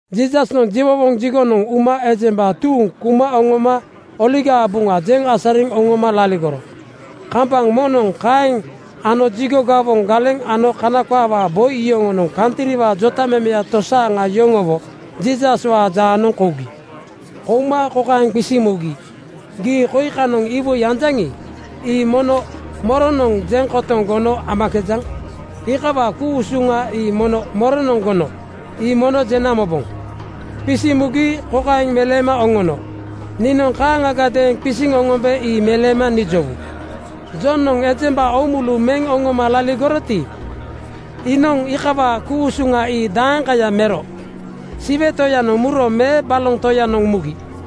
Jiisasnoŋ jiwowoŋ jigonoŋ uma ejemba tuuŋ kuma oŋoma Oligaa Buŋa jeŋ asariŋ oŋoma laligoro. Kambaŋ moŋnoŋ kaeŋ ano jigo gawoŋ galeŋ ano Kana qaawaa boi yoŋonoŋ kantriwaa jotamemeya tosaaŋa yoŋowo Jiisaswaa jaanoŋ kougi. Kouma kokaeŋ qisiŋ mugi, “Gii koi kanoŋ iwoi anjaŋi, ii mono moronoŋ jeŋ kotoŋ gono amakejaŋ? Iikawaa ku-usuŋa ii mono moronoŋ gono? Ii mono jena moboŋ.” Qisiŋ mugi kokaeŋ meleema oŋono, “Niinoŋ kaaŋagadeeŋ qisiŋ oŋombe ii meleema nijowu. Jonoŋ ejemba oomulu meŋ oŋoma laligoroti, iinoŋ iikawaa ku-usuŋa ii daeŋkaya mero? Siwe Toyanoŋ muro me baloŋ toyanoŋ mugi?”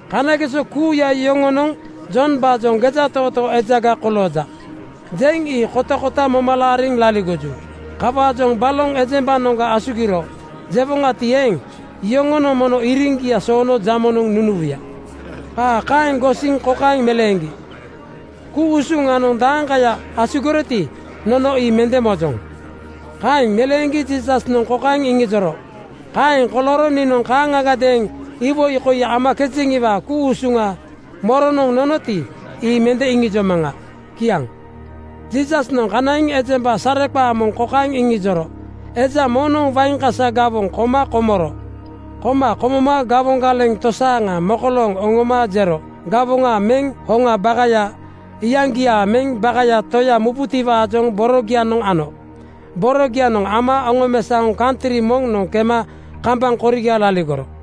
Kanageso kuuya yoŋonoŋ Jombaajoŋ ‘Gejatootoo ejaga kolooja,’ jeŋ ii kotakota moma laariŋ laligoju. Kawaajoŋ ‘Baloŋ ejembanoŋa asugiro,’ jewoŋati eeŋ, yoŋonoŋ mono iriŋgia soono jamonoŋ nunuwuya.” Qaa kaeŋ gosiŋ kokaeŋ meleeŋgi, “Ku-usuŋanoŋ daeŋkaya asugiroti, nono ii mende mojoŋ.” Kaeŋ meleeŋgi Jiisasnoŋ kokaeŋ iŋijoro, “Kaeŋ kolooro niinoŋ kaaŋagadeeŋ iwoi koi amakejeŋiwaa ku-usuŋa moronoŋ nonoti, ii mende iŋijomaŋa.” Kiaŋ. Jiisasnoŋ kanaiŋ ejemba sareqaanoŋ kokaeŋ iŋijoro, “Eja moŋnoŋ wain kasa gawoŋ koma komoro. Koma komoma gawoŋ galeŋ tosaaŋa mokolooŋ oŋoma jero gawoŋa meŋ hoŋaa bakaya iyaŋgia meŋ bakaya toya mubutiwaajoŋ borogianoŋ ano. Borogianoŋ ama oŋomesaoŋ kantri moŋnoŋ kema kambaŋ koriga laligoro.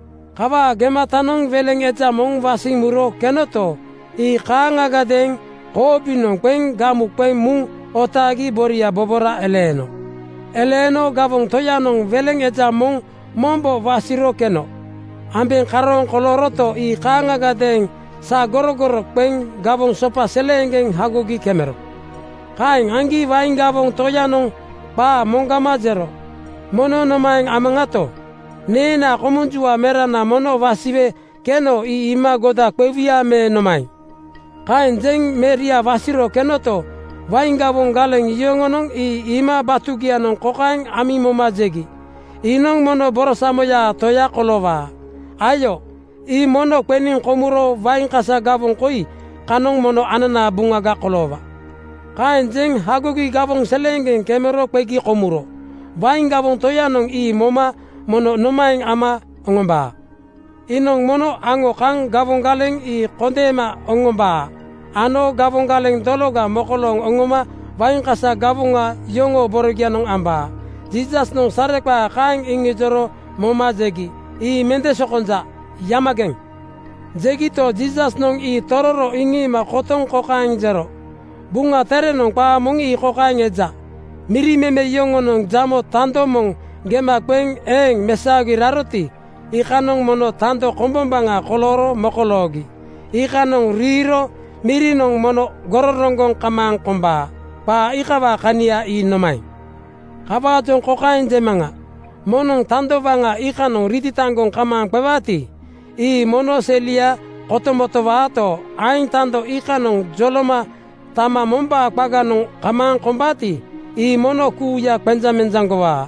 Kawaa gematanoŋ weleŋ eja moŋ wasiŋ muro kenoto, ii kaaŋagadeeŋ koobinoŋ qeŋ gamu qeŋ muŋ otaagi boria bobora eleeno. Eleeno gawoŋ toyanoŋ weleŋ eja moŋ mombo wasiro keno ambeŋ karooŋ kolooroto, ii kaaŋagadeeŋ sagorogoro qeŋ gawoŋ sopa seleeŋgeŋ hagogi kemero. “Kaeŋ aŋgi wain gawoŋ toyanoŋ qaa moŋgama jero, ‘Mono nomaeŋ amaŋato? Neenaa komunjua merana mono wasiwe keno ii iima goda qewuya me nomaeŋ?’ Kaeŋ jeŋ meria wasiro kenoto, wain gawoŋ galeŋ yoŋonoŋ ii iima batugianoŋ kokaeŋ amiŋ moma jegi, ‘Iinoŋ mono borosamoyaa toya koloowaa. Ayo, ii mono qeniŋ komuro wain kasa gawoŋ koi kanoŋ mono ananaa buŋaga koloowaa.’ Kaeŋ jeŋ hagogi gawoŋ seleeŋgeŋ kemero qegi komuro. Wain gawoŋ toyanoŋ ii moma mono nomaeŋ ama oŋombaa? Iinoŋ mono aŋo kaŋ gawoŋ galeŋ ii kondeema oŋombaa ano gawoŋ galeŋ dologa mokolooŋ oŋoma wain kasa gawoŋa yoŋoo borogianoŋ ambaa.” Jiisasnoŋ sareqaa kaeŋ iŋijoro moma jegi, “Ii mende sokonja. Yamageŋ (kozigeŋ)!” Jegito, Jiisasnoŋ ii tororo iŋiima kotoŋ kokaeŋ jero, “Buŋa Terenoŋ qaa moŋ ii kokaeŋ eja, ‘Miri meme yoŋonoŋ jamo tando moŋ gema qeŋ eeŋ mesaogi raroti, iikanoŋ mono tando kombombaŋa kolooro mokoloogi. Iikanoŋ riiro mirinoŋ mono gororoŋgoŋ kamaaŋ kombaa.’ Qaa iikawaa kania ii nomaeŋ? Kawaajoŋ kokaeŋ jemaŋa: Moŋnoŋ tando waŋa iikanoŋ ritataŋgoŋ kamaaŋ qewaati, ii mono selia kotomotowaato, aeŋ tando iikanoŋ joloma tama mombaa qaganoŋ kamaaŋ kombaati, ii mono kuuya qenjaŋmenjaŋgowaa.”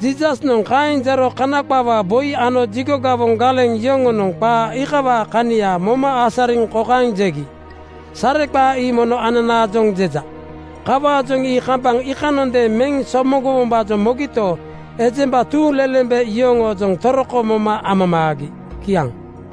Jiisasnoŋ kaeŋ jero Kana qaawaa boi ano jigo gawoŋ galeŋ yoŋonoŋ qaa iikawaa kania moma asariŋ kokaeŋ jegi, “Sareqaa ii mono ananaojoŋ jeja.” Kawaajoŋ ii kambaŋ iikanondeeŋ meŋ somoŋgowombaajoŋ mogito, ejemba tuuŋlelembe yoŋoojoŋ toroko moma amamaagi. Kiaŋ.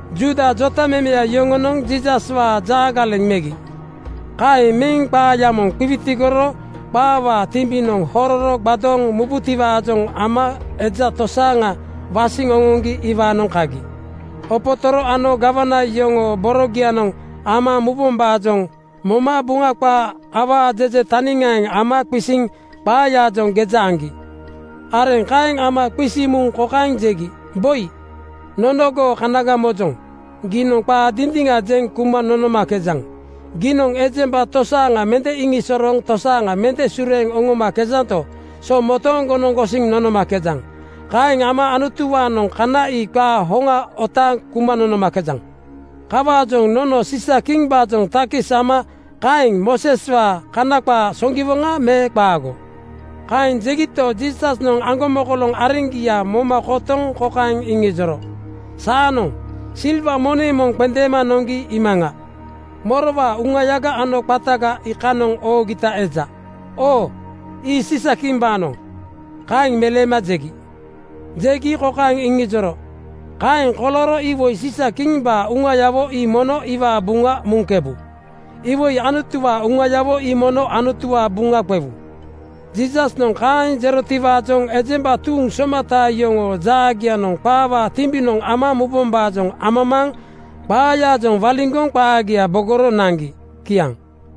Juuda jotamemeya yoŋonoŋ Jiisaswaa jaagaleŋ megi. Kaeŋ meŋ qaaya moŋ qiwitigoro qaawaa timbinoŋ hororo gbadooŋ mubutiwaajoŋ ama eja tosaaŋa wasiŋ oŋoŋgi iwaanoŋ kagi. Opotoro ano gawana yoŋoo borogianoŋ ama mubombaajoŋ moma Buŋa qaa awaa jeje taniŋaaŋ ama qisiŋ qaayaajoŋ geja aŋgi. Areŋ kaeŋ ama qisiŋ muŋ kokaeŋ jegi, “Boi, nono goo kanaga mojoŋ. Giinoŋ qaa dindiŋa jeŋ kuma nonomakejaŋ. Giinoŋ ejemba tosaaŋa mende iŋisosorooŋ tosaaŋa mende sureeŋ oŋomakejanto, so motooŋgonoŋ gosiŋ nonomakejaŋ. Kaeŋ ama Anutuwaanoŋ kana ii qaa hoŋa otaaŋ kuma nonomakejaŋ. Kawaajoŋ nono Siisa-kimbaajoŋ takis ama kaeŋ Mooseswaa Kana qaa soŋgiwoŋa me qaago?” Kaeŋ jegito, Jiisasnoŋ aŋgomokoloŋ areŋgia moma kotoŋ kokaeŋ iŋijoro, “Saanoŋ silwa moneŋ moŋ qendeema noŋgi iimaŋa. Morowaa uŋayaga ano qataga ii kanoŋ oogita eja?” “Oo, ii Siisa-kimbaanoŋ,” kaeŋ meleema jegi. Jegi kokaeŋ iŋijoro, “Kaeŋ kolooro iwoi Siisa-kimbaa uŋayawo ii mono iwaa buŋa muŋkebu. Iwoi Anutuwaa uŋayawo ii mono Anutuwaa buŋa qewu.” Jiisasnoŋ kaeŋ jerotiwaajoŋ ejemba tuuŋ somata yoŋoo jaagianoŋ qaawaa timbinoŋ ama mubombaajoŋ amamaaŋ qaayaajoŋ waliŋgoŋ qaagia bogoro naŋgi. Kiaŋ.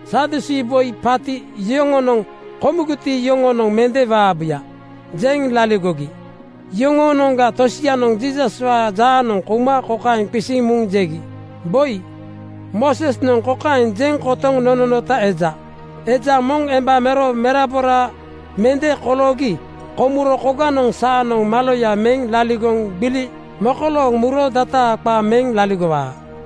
Sadusii boi paati yoŋonoŋ “Komugiti, iyoŋonoŋ mende waabuya,” jeŋ laligogi. Yoŋoonoŋga tosianoŋ Jiisaswaa jaanoŋ kouma kokaeŋ qisiŋ muŋ jegi, “Boi, Moosesnoŋ kokaeŋ jeŋ kotoŋ nononota eja, ‘Eja moŋ emba mero merabora mende koloogi komuro koganoŋ saanoŋ maloya meŋ laligoŋ gbili mekolooŋ muro dataa qa meŋ laligowa.’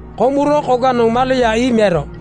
Komuro koganoŋ maloya ii mero.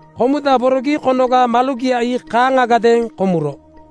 Komudaborogi konoga malogia ii kaaŋagadeeŋ komuro.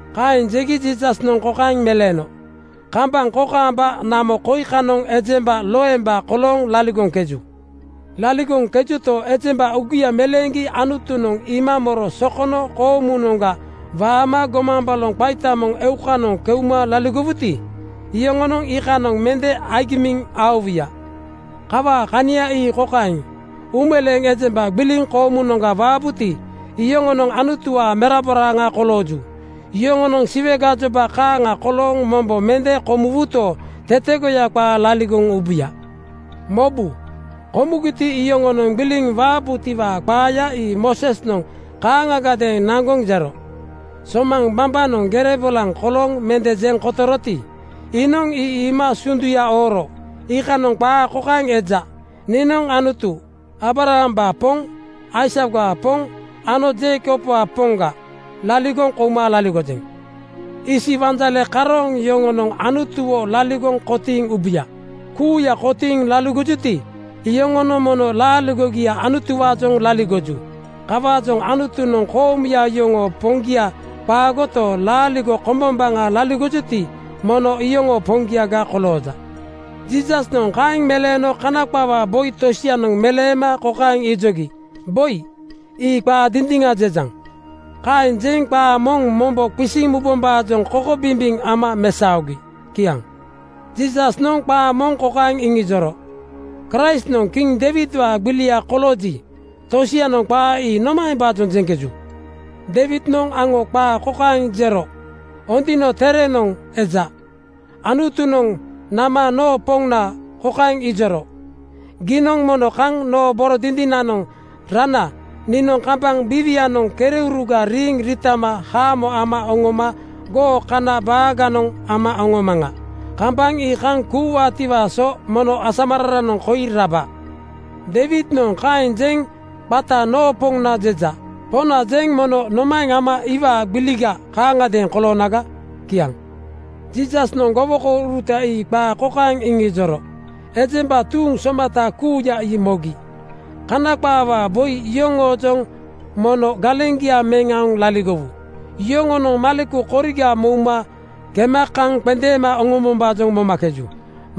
Kaeŋ jegi Jiisasnoŋ kokaeŋ meleeno, “Kambaŋ kokaamba namo koi kanoŋ ejemba loemba kolooŋ laligoŋkeju. Laligoŋkejuto, ejemba uugia meleeŋgi Anutunoŋ iima moro sokono koomunoŋga waama gomaŋ baloŋ qaita moŋ eukanoŋ keuma laligowuti, iyoŋonoŋ iikanoŋ mende agimiŋ aowuya. “Kawaa kania ii kokaeŋ: Uumeleeŋ ejemba gbiliŋ koomunoŋga waabuti, iyoŋonoŋ Anutuwaa meraboraaŋa kolooju. Yoŋonoŋ Siwe gajoba kaaŋa kolooŋ mombo mende komuwuto, tetegoya qaa laligoŋ ubuya. Mobu! Komugiti, iyoŋonoŋ gbiliŋ waabutiwaa qaaya ii Moosesnoŋ kaaŋagadeeŋ naŋgoŋ jero. Somaŋ bambanoŋ gere bolaŋ kolooŋ mende jeŋ kotoroti, iinoŋ ii iima sunduya ooro iikanoŋ qaa kokaeŋ eja, ‘Niinoŋ Anutu Aabrahambaa Poŋ, Aisakwaa Poŋ ano Jeikobwaa Poŋga laligoŋ kouma laligojeŋ.’ Isi wanjale karooŋ yoŋonoŋ Anutuwo laligoŋ kotiiŋ ubuya. Kuuya kotiiŋ laligojuti, iyoŋonoŋ mono laaligogia Anutuwaajoŋ laligoju. Kawaajoŋ Anutunoŋ koomuya yoŋoo Poŋgia qaagoto, laaligo kombombaŋa laligojuti, mono iyoŋoo Poŋgiaga kolooja.” Jiisasnoŋ kaeŋ meleeno Kana qaawaa boi tosianoŋ meleema kokaeŋ ijogi, “Boi, ii qaa dindiŋa jejaŋ.” Kaeŋ jeŋ qaa moŋ mombo qisiŋ mubombaajoŋ kokobimbiŋ ama mesaogi. Kiaŋ. Jiisasnoŋ qaa moŋ kokaeŋ iŋijoro, “Kraistnoŋ Kiŋ Deiwidwaa gbilia kolooji, tosianoŋ qaa ii nomaembaajoŋ jeŋkeju? Deiwidnoŋ aŋo qaa kokaeŋ jero Ondino Terenoŋ (Buk song, Psalm) eja, ‘Anutunoŋ nama noo Poŋna kokaeŋ ijoro, Giinoŋ mono kaŋ noo boro dindinanoŋ rana niinoŋ kambaŋ biiwianoŋ kereuruga riiŋ riitama haamo ama oŋoma goo kana baaganoŋ ama oŋomaŋa. Kambaŋ ii kaŋ kuuwaatiwaa so mono asamararanoŋ koi raba.’ Deiwidnoŋ kaeŋ jeŋ qata ‘Noo Poŋna’ jeja. ‘Poŋna’ jeŋ mono nomaeŋ ama iwaa gbiliga kaaŋgadeeŋ koloonaga?” Kiaŋ. Jiisasnoŋ gowokouruta ii qaa kokaeŋ iŋijoro ejemba tuuŋ somata kuuya ii mogi, “Kana qaawaa boi yoŋoojoŋ mono galeŋgia meŋ aoŋ laligowu. Yoŋonoŋ maleku koriga mouma kema kaŋ qendeema oŋombombaajoŋ momakeju.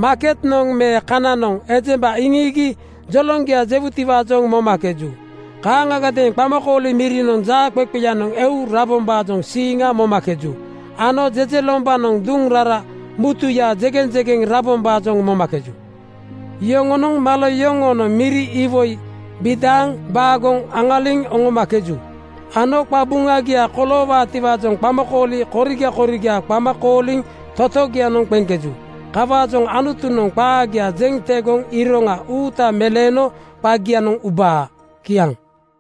Maaketnoŋ me kananoŋ ejemba iŋiigi joloŋgia jewutiwaajoŋ momakeju. Kaaŋagadeeŋ qamakooli mirinoŋ jaaqeqeyanoŋ eu rabombaajoŋ siiŋa momakeju ano jejelombanoŋ duŋ rara mutuyanoŋ jegeŋjegeŋ rabombaajoŋ momakeju. Yoŋonoŋ malo yoŋoonoŋ miri iwoi bidaaŋ baagoŋ aŋaliŋ oŋomakeju ano qabuŋagia koloowaatiwaajoŋ qamakooli koriga koriga qama kooliŋ totogianoŋ qeŋkeju. Kawaajoŋ Anutunoŋ qaagia jeŋ tegoŋ iroŋa uuta meleeno qagianoŋ ubaa.” Kiaŋ.